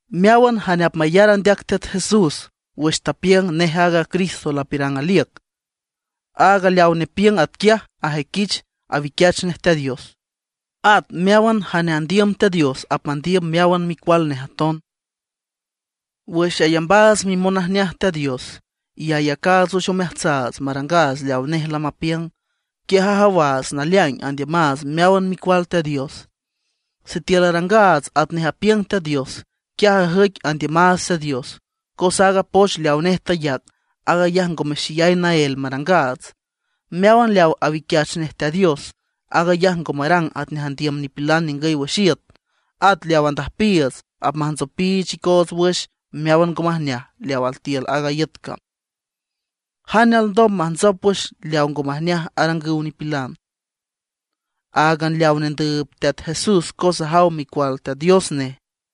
Meáwan jane apmayar andeac Teat Jesús wüx tapiüng nej aaga Cristo lapiürang aliüc, aaga leaw nepiüng atquiaj ajüiquich awiquiach nej Teat Dios. At meáwan jane andiüm Teat Dios apmandiüm meáwan micual nej aton. Wüx ayambaats mimonajneaj Teat Dios, y ayacaats wüx omeajtsaats marangaats leawa nej lamapiüng, quiaj ajawaats naleaing andiümaats meáwan micual Teat Dios. Sitiül arangaats atnej apiüng Teat Dios, quiaj ajüic andiümaats Teat Dios, cos aaga poch leawa nej tayac, aag ayaj ngome xeyay naél marangaats. Meáwan leaw awiquiach nej Teat Dios, aag ayaj ngo marang atnej andiüm nipilan ningüy wüx iüt. At leaw andüjpiiüts apmantsopiich icoots wüx meáwan ngo majneaj leaw altiül aaga iüt cam. ¿Jane alndom majntsop wüx leaw ngo majneaj arangüw nipilan? Áagan leaw nendüüb Teat Jesús cos ajaw Micual Teat Dios nej.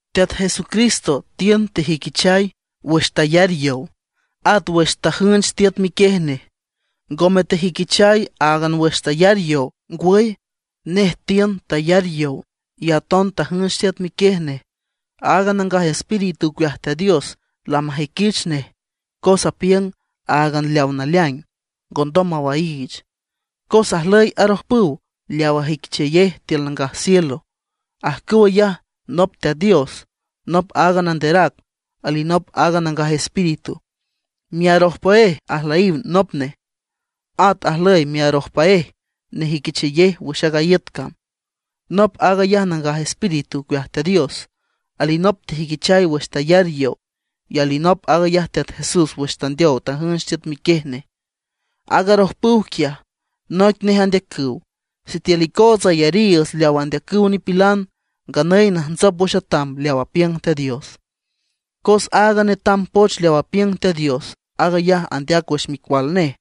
Teat Jesucristo tiün tejüiquichay wüx tayar yow, at wüx tajünch tiüt miquiej nej. Ngome tejüiquichay áagan wüx tayar yow; ngwüy, nej tiün, tayar yow, y aton tajünch tiüt miquiej nej. Aaga Nangaj Espíritu ocueaj Teat Dios lamajüiquich nej cos apiüng áagan leaw naleaing, ngondom mawaiich. Cos ajlüy arojpüw leaw ajüiquichayej tiül nangaj cielo. Ajcüw ayaj nop Teat Dios, nop aaga Nanderac, alinop aaga Nangaj Espíritu; miarojpüéj ajlüyiw nop nej. At ajlüy miarojpüéj nejüiquichayej wüx aaga iüt cam. Nop aag ayaj Nangaj Espíritu ocueaj Teat Dios; alinop tejüiquichay wüx tayar yow; y alinop aag ayaj Teat Jesús wüx tandeow tajünch tiüt miquiej nej. Aaga arojpüw quiaj, noic nej andeacüw. Sitiül icootsa ayariiüts leaw andeacüw nipilan, nganüy najntsop wüx atam leaw apiüng Teat Dios. Cos aaga netam poch leaw apiüng Teat Dios, aag ayaj andeac wüx Micual nej.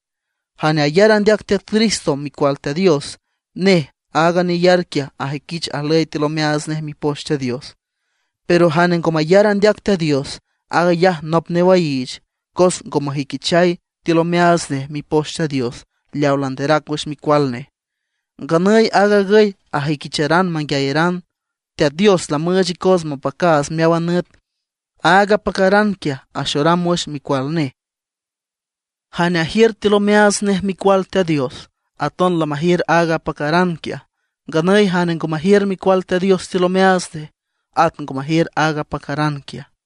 Jane ayar andeac Teat Cristo micual Teat Dios, nej aaga neyar quiaj ajüiquich ajlüy tiül omeaats nej Mipoch Teat Dios. Pero jane ngo mayar andeac Teat Dios, aag ayaj nop newaiich, cos ngo mejüiquichay tiül omeaats nej Mipoch Teat Dios leawa landerac wüx Micual nej. Nganüy aag agüy ajüiquicharan manguiayaran: Teat Dios lamüüch icoots mapacaats meáwan nüt; aaga apacaran quiaj axoram wüx Micual nej. Jane ajiür tiül omeaats nej Micual Teat Dios, aton lamajiür aaga apacaran quiaj. Nganüy jane ngo majiür Micual Teat Dios tiül omeaats nej, at ngo majiür aaga apacaran quiaj.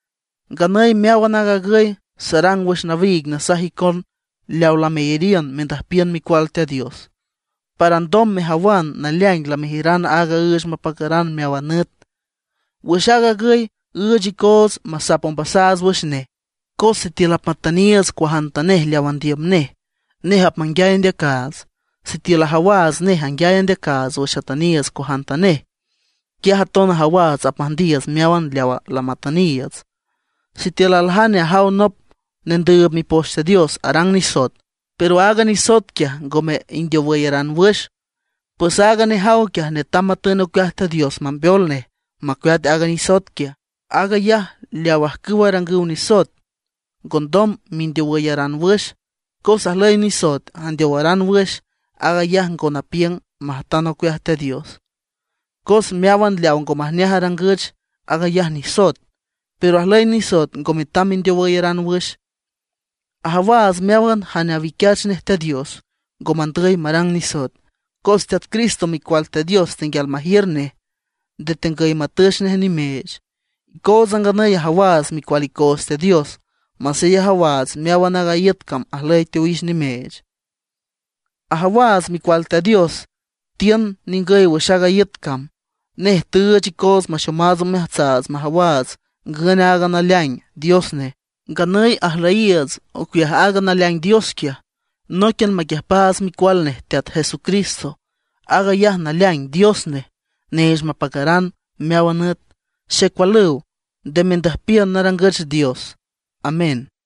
Nganüy meáwan aag agüy sarang wüx nawiig nasaj icon leaw lameyariün mendüjpiün Micual Teat Dios, para alndom mejawan naleaing lamejiüran aaga üüch mapacaran meáwan nüt. Wüx aag agüy üüch icoots masap ombasaats wüx nej; cos sitiül apmatüniiüts cuajantanej leaw andiüm nej, nej apmanguiay andeacaats. Sitiül ajawaats nej anguiay andeacaats wüx atüniiüts cuajantanej, quiaj aton ajawaats apmüjndiiüts meáwan leawa lamatüniiüts. Sitiül aljane ajaw nop nendüüb Mipoch Teat Dios arang nisoet, pero aaga nisoet quiaj ngome indeowüyaran wüx, pues aaga nejaw quiaj netam matün ocueaj Teat Dios mambeol nej macueat aaga nisoet. Aag ayaj leaw ajcüw arangüw nisoet ngondom mindeowüyaran wüx. Cos ajlüy nisoet andeowaran wüx, aag ayaj ngo napiüng majtan ocueaj Teat Dios. Cos meáwan leaw ngo majneaj arangüch, aag ayaj nisoet. Pero ajlüy nisoet ngo metam mindeowüyaran wüx. Ajawaats meáwan jane awiquiach nej Teat Dios, ngo mandüy marang nisoet, cos Teat Cristo Micual Teat Dios tenguial majiür nej, nde tegüy matüch nej nimeech. Icootsa nganüy ajawaats micual icoots Teat Dios, masey ajawaats meáwan aaga iüt cam ajlüy teowix nimeech. Ajawaats Micual Teat Dios tiün ningüy wüx aaga iüt cam; nej tüüch icoots maxomaats omeajtsaats majawaats ngün aaga naleaing Dios nej. Nganüy ajlüyiiüts ocueaj aaga naleaing Dios quiaj, nóiquian maquiüjpaats Micual nej Teat Jesucristo. Aag ayaj naleaing Dios nej, neech mapacaran meáwan nüt. Xecualüw, nde mendüjpiün narangüch dioses. Amén.